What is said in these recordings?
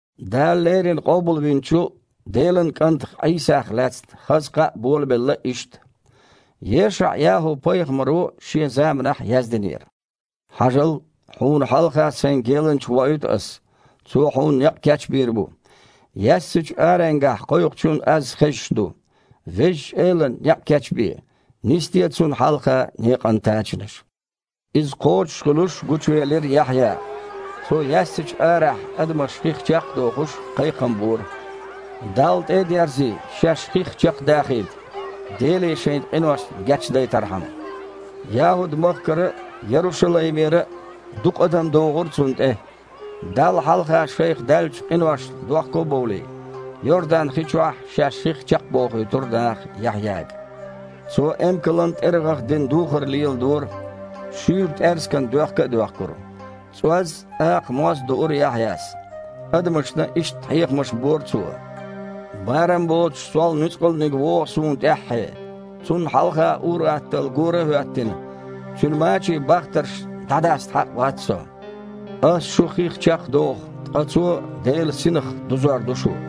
Дала леррина къобалвинчу Делан КІантах Іийсах лаьцна хаза кхаъ болабелла иштта. ЕшаІ-ЯхІу-пайхамаро шен заманахь яздинера: «Хьажал! Хьуна хьалха Сайн геланча воуьйту Ас. Цо Хьуна некъ кечбийр бу. Яьссачу аренгахь кхойкхучун аз хезаш ду: „Везачу Элана некъ кечбе, нисде Цунна хьалха некъан тачанаш“». Иза кхочушхуьлуш гучувелира Яхьъя. Цо, яьссачу арахь адамаш хих чекх а дохуш, кхайкхам бора: «Далла тІе а дерзий, шаьш хих чекхдахийта, Деле шайн къиношна гечдайтархьама». ЯхІуд-махкара а, Ярушалаймера а дукха адам догІура цунна тІе. Далла хьалха шайх даьллачу къиношна дохко а бовлий, Йордан-хи чохь шаьш хих чекхбохуьйтура наха Яхьъяга. Цо эмкалан тІергІах дина духар леладора, шуьйра тІаьрсиган доьхка а доьхкура. ЦІоз а, акха моз а дуура Яхьъяс. Адамашна иштта хьехамаш бора цо: «Барам боцуш сол нуьцкъалниг вогІу суна тІаьххье. Цунна хьалха ур-атталла гора а хІоьттина, Цуьнан мачийн бахтарш дІадаста хьакъ вац со. Аса шу хих чекхдоху, ткъа Цо Делан Синах дузор ду шу».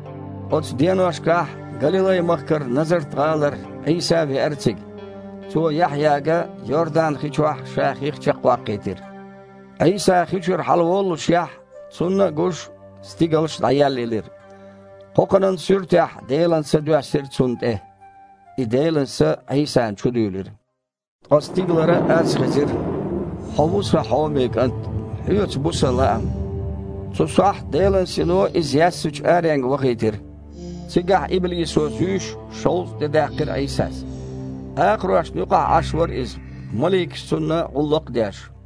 Оцу деношкахь Галилай-махкара Назарт-гІалара Іийса а веара цига. Цо Яхьъяга Йордан-хи чохь Ша хих чекхваккхийтира. Іийса хи чуьра хьалаволлушехь, Цунна а гуш, стигалш дІаеллаелира. Кхокханан суьртехь Делан Са доьссира Цунна тІе. И Делан Са Іийсана чу дуьйлира. Ткъа стигалара аз хезира: «Хьо ву Сан хьоме КІант! Хьоьца бу Сан лаам». Цу сохьта Делан Сино Иза яьссачу аренга вахийтира. Цигахь иблисо зуьйш, шовзткъа де даьккхира Іийсас. Акхарошна юкъахь Іаш вара Иза, маликаша Цунна гІуллакх а деш.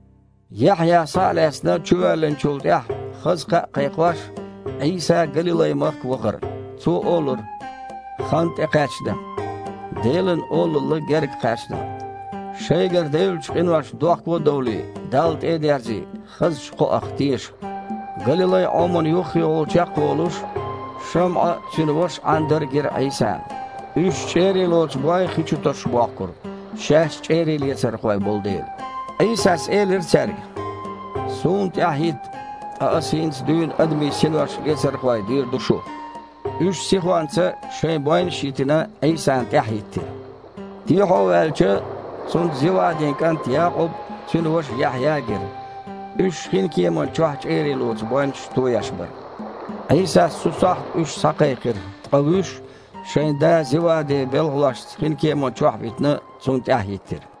Яхьъя, схьа а лаьцна, чувоьллинчул тІаьхьа, хаза кхаъ кхайкхош, Іийса Галилай-махка вахара. Цо олура: «Хан тІекхаьчна. Делан Олалла гергакхаьчна. Шайгара девллачу къиношна дохко а довлий, Далла тІе а дерзий, хазачу кхоах теша». Галилай-Іомана юххехула чекхволуш, ШамІа а, цуьнан ваша Іандар а гира Іийсана. Уьш чІерий лоцу бой хи чу тосуш бохкура, шаьш чІерийлецархой болу дела. Іийсас элира цаьрга: «Суна тІаьхьахІитта, ткъа Аса хІинца дуьйна адамийн синош лецархой дийр ду шух». Уьш, сихонца шайн бойнаш а йитина, Іийсана тІаьхьахІиттира. Дехьо ваьлча, Цунна Зевадин кІант Якъуб а, цуьнан ваша Яхьъя а гира. Уьш хинкеман чохь чІерий лоцу бойнаш тоеш бара. Іийсас цу сохьта уьш схьакхайкхира, ткъа вуьш, шайн да Зевади белхалошца хинкеман чохь а витина, Цунна тІаьхьа хІиттира.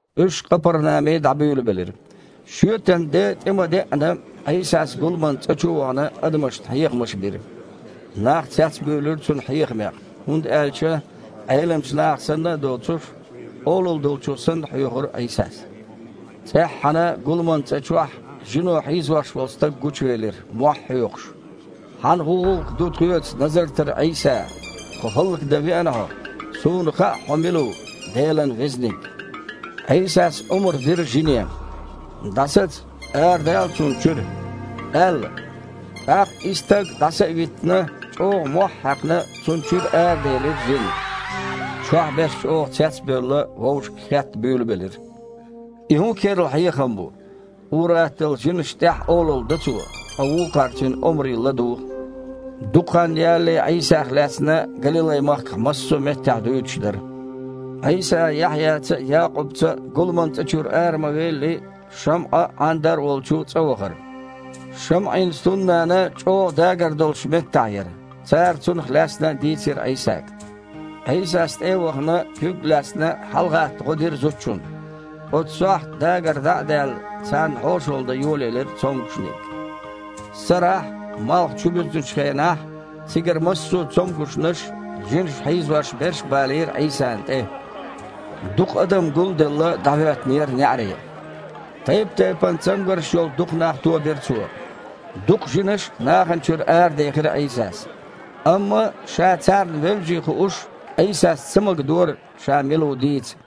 Уьш Къапарнаме дІабуьйлабелира. Шоьтан де тІе ма деъана, Іийсас гуламан цІа чу а вахана, адамашна хьехамаш бира. Нах цецбуьйлура Цуьнан хьехамех, хІунда аьлча Іеламчу наха санна а доцуш, олалла долчо санна хьоьхура Іийсас. ЦІеххьана гуламан цІа чохь жино хьийзош волу стаг гучувелира, мохь а хьоькхуш: «Хьан хІун гІуллакх ду тхоьца Назартара Іийса? Тхо хІаллакдан веана Хьо? Суна хаьа Хьо мила ву – Делан Везаниг!» Іийсас омра дира жине: «ДІасаца! Арадала цунна чуьра!» – аьлла. ТІаккха, и стаг дІаса а виттина, чІогІа мохь а хьаькхна, цунна чуьра араделира жин. Чохь берш чІогІа цецбевлла, вовшашка хетта буьйлабелира: «И хІун керла хьехам бу? Ур-атталла жинашна тІехь а олалла до Цо, ткъа вукхара Цуьнан омре ладугІу». Дукха хан ялале Іийсах лаьцна Галилай-махкахь массо а меттехь дуьйцуш дара. Іийса Яхьъяца а, Якъубца а гуламан цІа чуьра ара ма велли, ШамІа а, Іандар а волчу цІа вахара. ШамІин стуннана чІогІа дагар долуш меттахь яра, цара цунах лаьцна дийцира Іийсага. Іийсас, тІе а вахана, куьг а лаьцна, хьалагІатта гІо дира зудчунна. Оцу сохьта дагар дІа а даьлла, царна хьошалла дан йолаелира цомгушниг. Сарахь, малх чубуьзначу хенахь, цигара массо цомгушнаш а, жинаша хьийзош берш а балийра Іийсана тІе. Дукха адам гулделла дІахІоьттинера неІаре. Тайп-тайпана цамгарш йолу дукха нах тобира Цо. Дукха жинаш а нахана чуьра арадехира Іийсас, амма, Ша царна вевзий хууш, Іийсас ца магадора, Ша мила ву дийца.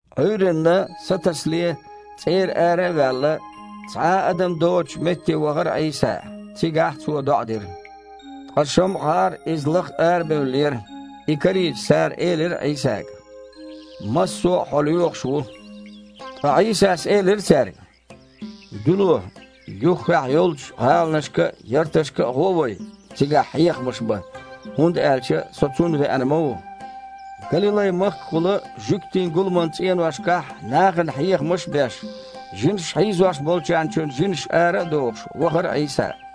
Іуьйранна, сатасале, цІера ара а ваьлла, цхьа а адам доцучу метте вахара Іийса. Цигахь Цо доІа дира. Ткъа ШамІагІар Иза лаха арабевллера. И карийча, цара элира Іийсага: «Массо а Хьо лоьхуш ву». Ткъа Іийсас элира цаьрга: «Дуьло, юххехь йолчу гІаланашка а, ярташка а гІо вай, цигахь хьехамаш бан, хІунда аьлча Со цунна веана ма ву». Галилай-махкахула жуьгтийн гуламан цІеношкахь нахана хьехамаш а беш, жинаша хьийзош болчарна чуьра жинаш ара а дохуш, вахара Іийса.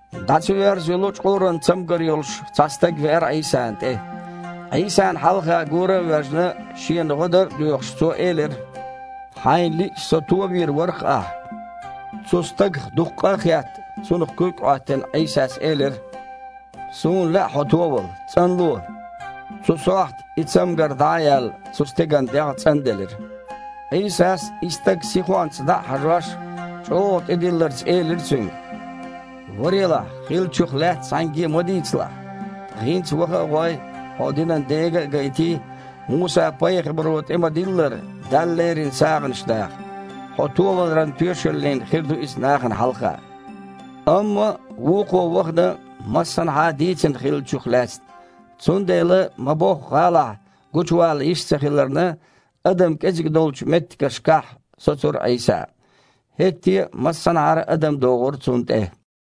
ДІа ца йоьрзу йолу чкъуран цамгар йолуш цхьа стаг веара Іийсана тІе. Іийсана хьалха гора а воьжна, шена гІо дар а доьхуш, цо элира: «Хьайна лиъча, со товийр вара-кх Ахьа». Цу стагах дукха къа а хетта, цунах куьг а Іоьттина, Іийсас элира: «Суна лаьа хьо товала! ЦІанло!» Цу сохьта, и цамгар дІа а яьлла, цу стеган дегІ цІанделира. Іийсас, и стаг сихонца дІа а хьажош, чІогІа тІедилларца элира цуьнга: «Варелахь, хиллачух лаьцна цхьаьнгге а ма дийцалахь. Ткъа хІинца ваха а гІой, хьо динан дега а гайтий, Муса-пайхамаро тІе-ма-диллара, Далла лерина сагІанаш даха. Хьо товаларан тоьшаллина хир ду иза нахана хьалха». Амма вукхо вахана массанхьа дийцина хиллачух лаьцна, цундела, ма-бохху гІалахь гучувала йиш ца хиларна, адам кІеззиг долчу меттигашкахь соцура Іийса. ХІетте а массанхьара а адам догІура Цунна тІе.